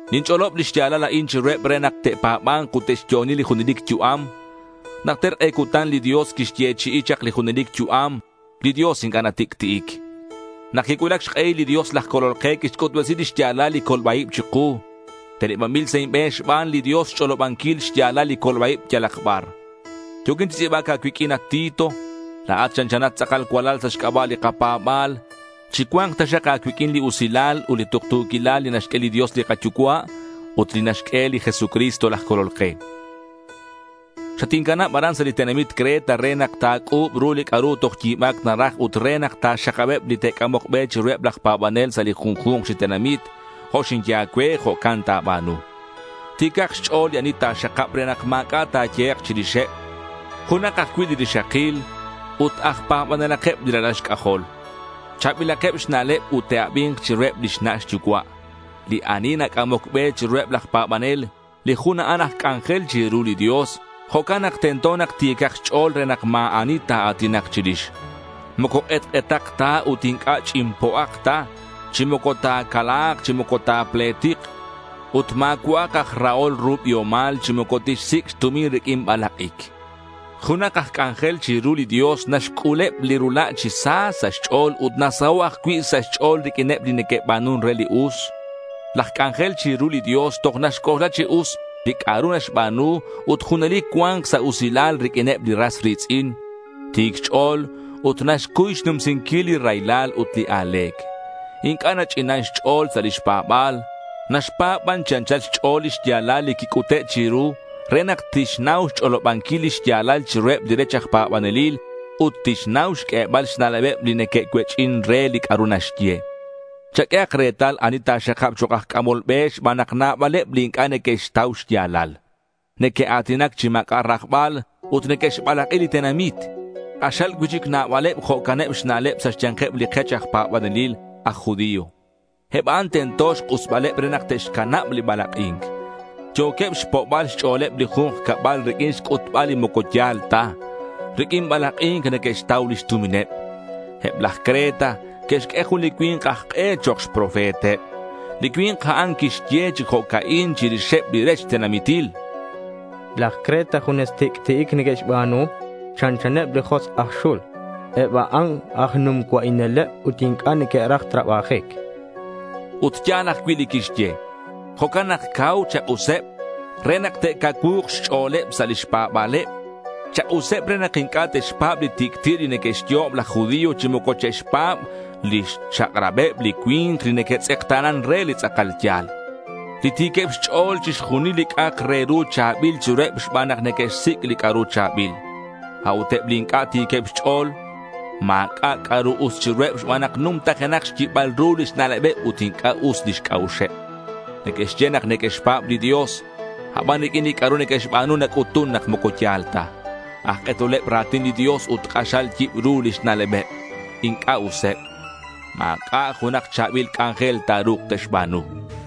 Ninch'olob li xya̱lal a'in chiruheb re nak te'pa̱ba̱nk ut te'xyo'oni li junelic yu'am. Najter k'e cutan li Dios quixyechi'i chak li junelic yu'am. Li Dios inc'a' natic'ti'ic. Nak quicuulac xk'ehil li Dios laj Colol ke quixc'utbesi li xya̱lal li colba-ib chiku. Tenebanbil sa' inbe̱n xban li Dios xch'olobanquil xya̱lal li colba-ib yalak bar. Yo̱quin chi tz'i̱bac a̱cuiq'uin, at Tito. La̱at chanchanat tz'akal cualal sa' xc'aba' li kapa̱ba̱l. Chicua̱nk taxak a̱cuiq'uin li usilal ut li tuktu̱quilal li naxq'ue li Dios li kaYucua' ut li naxq'ue li Jesucristo laj Colol ke. Xatincanab aran sa' li tenamit Creta re nak ta̱c'u̱b ru li c'a'ru toj yi̱ba̱c naraj ut re nak ta̱xakabeb li te'c'amok be chiruheb laj pa̱banel sa' li junju̱nk chi tenamit. Jo' xinye a̱cue, jo'can ta̱ba̱nu. Ti̱cak xch'o̱l li ani ta̱xakab re nak ma̱c'a' ta̱yehek' chirixeb. Junak ajcui' li rixakil ut aj pa̱banelakeb li ralal xc'ajol. Cha̱bilakeb xna'leb ut te'abi̱nk chiruheb lix na' xyucua'. Li ani nac'amoc be chiruheb laj pa̱banel, li jun a'an aj c'anjel chiru li Dios. Jo'can nak tento nak ti̱cak xch'o̱l re nak ma̱ ani ta̱a̱tinak chirix. Moco k'etk'etak ta ut moco ch'inpo'ak ta, chi moco ta̱cala̱k, chi moco ta̱pletik. Ut ma̱cua'ak aj rahol ru biomal, chi moco tixsic' xtumin riq'uin balak'ic. Junak aj c'anjel chiru li Dios naxc'uleb li rula' chi sa sa' xch'o̱l ut nasaho' ajcui' sa' xch'o̱l riq'uineb li neque'ba̱nun re li us. Laj c'anjel chiru li Dios toj naxc'oxla chi us li c'a'ru naxba̱nu ut junelic cua̱nk sa' usilal riq'uineb li ras ri̱tz'in. Ti̱c xch'o̱l ut naxcuy xnumsinquil li raylal ut li a̱le̱c. Inc'a' nach'inan xch'o̱l sa' lix pa̱ba̱l. Naxpa̱b ban chi anchal xch'o̱l li xya̱lal li quic'ute' chiru re nak tixnau xch'olobanquil li xya̱lal chiruheb li rech aj pa̱banelil ut tixnau xq'uebal xna'lebeb li neque'cuech'in re li c'a'ru naxye. Chaq'uehak retal ani ta̱xakab chok' aj c'amol be xban nak nabaleb li inc'a' neque'xtau xya̱lal. Neque'a̱tinac chi ma̱c'a' rajbal ut neque'xbalak'i li tenamit. K'axal cui'chic nabaleb jo'caneb xna'leb sa' xya̱nkeb li kech aj pa̱banelil aj judío. Eb a'an tento xk'usbaleb re nak te'xcanab li balak'i̱nc. Yo̱queb xpo'bal xch'o̱leb li ju̱nk cabal riq'uin xc'utbal li moco ya̱l ta. Riq'uin balak'i̱nc neque'xtau lix tumineb. Eb laj Creta que'xq'ue jun li cui̱nk aj k'e chok' xprofeteb. Li cui̱nk a'an quixye chi jo'ca'in chirixeb li rech tenamitil: laj Creta junes tic'ti'ic neque'xba̱nu. Chanchaneb li josk' aj xul. Eb a'an aj num cua'ineleb ut inc'a' neque'raj trabajic, chan. Ut ya̱l ajcui' li quixye. Jo'can nak cau chak'useb re nak te'cacuu̱k xch'o̱leb sa' lix pa̱ba̱leb. Chak'useb re nak inc'a' te'xpa̱b li tic'ti' li neque'xyo'ob laj judío chi moco che'xpa̱b lix chak'rabeb li cui̱nk li neque'tz'ekta̱nan re li tz'akal ya̱l. Li ti̱queb xch'o̱l, chixjunil li c'a'ak re ru cha̱bil chiruheb xban nak neque'xsic' li c'a'ru cha̱bil. A'ut eb li inc'a' ti̱queb xch'o̱l, ma̱c'a' c'a'ru us chiruheb xban nak numtajenak xyibal ru lix na'lebeb ut inc'a' us lix c'a'uxeb. Neque'xye nak neque'xpa̱b li Dios, aban riq'uin li c'a'ru neque'xba̱nu nac'utun nak moco ya̱l ta. Aj k'etoleb ra̱tin li Dios ut k'axal yibru lix na'lebeb. Inc'a' useb. Ma̱c'a' junak cha̱bil c'anjel ta̱ru̱k te'xba̱nu.